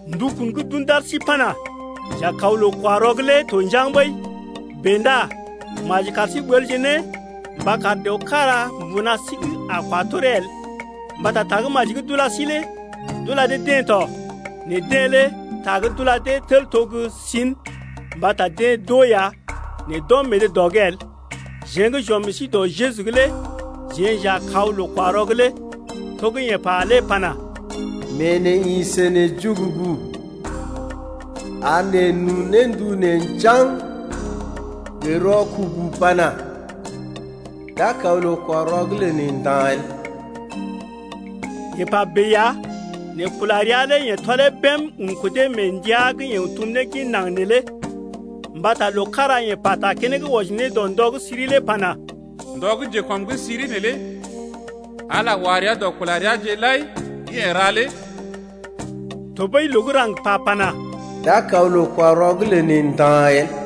Ndukun gə́ d’un d’ar sí pana: J’a kaw loo-kwa-rɔ’g lé to njaŋg ɓəi. Bèe ndá maji kar sí ɓəlje ne mba kar dəw kára mbuna sí’g a kwa toree el. Mbata Tagə́maji gə́ d’ula sí lé d’ula dee-deḛ tɔ, nɛ deḛ lé ta gə́ d’ula dee tel to gə́ sin mbata deḛ d’oo ya, nɛ d’ɔm meḛ dee dɔ’g el. Jeḛ gə́ j’ɔm meḛ sí dɔ Jeju’g lé jeḛ j’a kaw loo-kwa-rɔ’g lé. To gə́ yeḛ pa lé pana: Mee neḛ ḭ sə neḛ jugugu ar neḛ n’un ne ndu neḛ njaŋg gə rɔkubu pana: D’a kaw loo-kwa-rɔ’g lə neḛ nda̰ el. Yeḛ pa bèe ya nɛ kula rəa lé yeḛ tɔlee bém un kudee mee ndəa gə́ yeḛ tum ne gin naŋg neelé. Mbata loo kára yeḛ pata keneŋ wɔji ne dɔ ndɔ gə́ siri lé pana: Ndɔ gə́ njekɔm’g siri neelé Ala wa rəa dɔ kula reaje lai gə́ yeḛ ra lé. Tɔɓəi loo gə́ raŋg pa pana: D’a kaw loo-kwa-rɔ’g lə neḛ nda̰ el.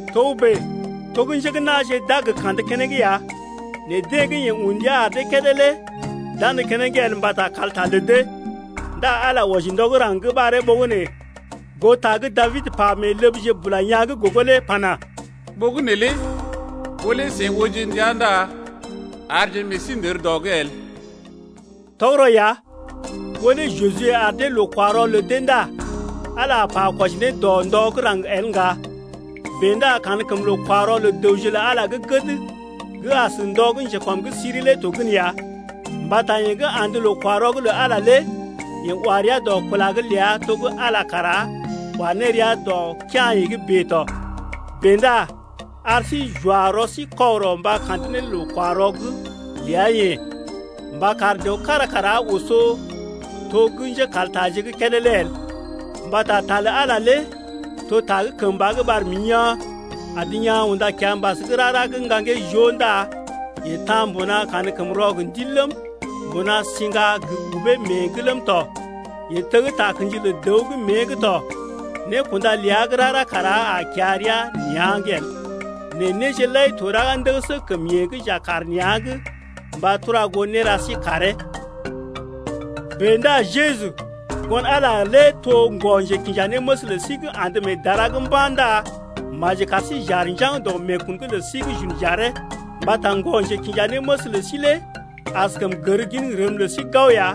Togə́bè to gə́ njé gə́ na̰je d’a gə kandə keneŋ ya nɛ deḛ gə́ yeḛ un ndia ar dee kédé lé d’andə keneŋ el mbata kalta lə dee. Ndá Ala wɔji ndɔ gə́ raŋg gə́ ɓaree ɓogənè goo ta gə́ Dabid pa mee ləbje bula yaa̰ gə́ gogo lé pana: Ɓogənè lé ɓó lé seḭ ooje ndia Ndá arje meḛ sí ndər dɔ’g el. Tɔgərɔ ya ɓó lé Juje ar dee loo-kwa-rɔ lə dee ndá Ala a pa kwɔji ne ndɔ gə́ raŋg el ŋga. Bèe ndá kankəm loo-kwa-rɔ lə dəwje lə Ala gə́ gəd gə́ as ndɔ gə́ njekɔm’g siri lé to gən ya. Mbata yeḛ gə́ andə loo-kwa-rɔ’g lə Ala lé yeḛ wa rəa dɔ kula’g ləa to gə́ Ala kara wa ne rəa dɔ kea̰-yeḛ’g bèe tɔ. Bèe ndá ar sí j’wa rɔ sí kɔgərɔ mba kandə ne loo-kwa-rɔ’g ləa-yeḛ mba kar dəw kára kara oso to gə́ njékaltaje gə́ kédé lé el. Mbata ta lə Ala lé to ta gə́ kəmba gə́ ɓar mḭ yaa̰, adə yaa̰ unda kiambas gə́ rara gə́ ŋgaŋgee joo ndá yee ta̰ mbuna kankəmrɔ gə ndil ləm, mbuna siŋga gə ubee mée’g ləm tɔ, yee teg takə̰ji lə dəw gə́ mée’g tɔ. Nékunda ləa gə́ rara kara a kiya rəa nea̰’g el, nɛ néje lai to raga ndəgəsə kəm yeḛ gə́ j’a kaar nea̰’g mba tura goo néra sí karee. Bèe ndá Jeju, Ŋgon-Ala lé to ŋgɔ-njekinjanéməs lə sí gə́ andə mee dara’g mba̰ ndá maji kar sí j’aar njaŋg dɔ meekun’g lə sí gə́ j’un j’aree. Mbata ŋgɔ-njekinjanéməs lə sí lé askəm gər gin rəm lə sí gao ya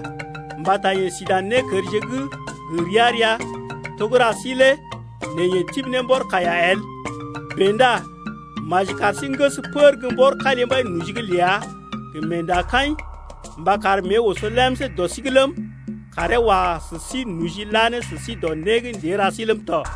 mbata yeḛ si dan nékərje gə́ gə ria-ria to gə́ ra sí lé nɛ yeḛ tibi ne mbɔr kaiya el. Bèe ndá maji kar sí n’ges pər gə́ mbɔr kalimbai noji’g ləa gə meendakaḭ mba kar mée oso lemsé dɔ sí’g ləm, karee wa sə sí noji la ne sə sí dɔ né gə́ ndée ra sí ləm tɔ.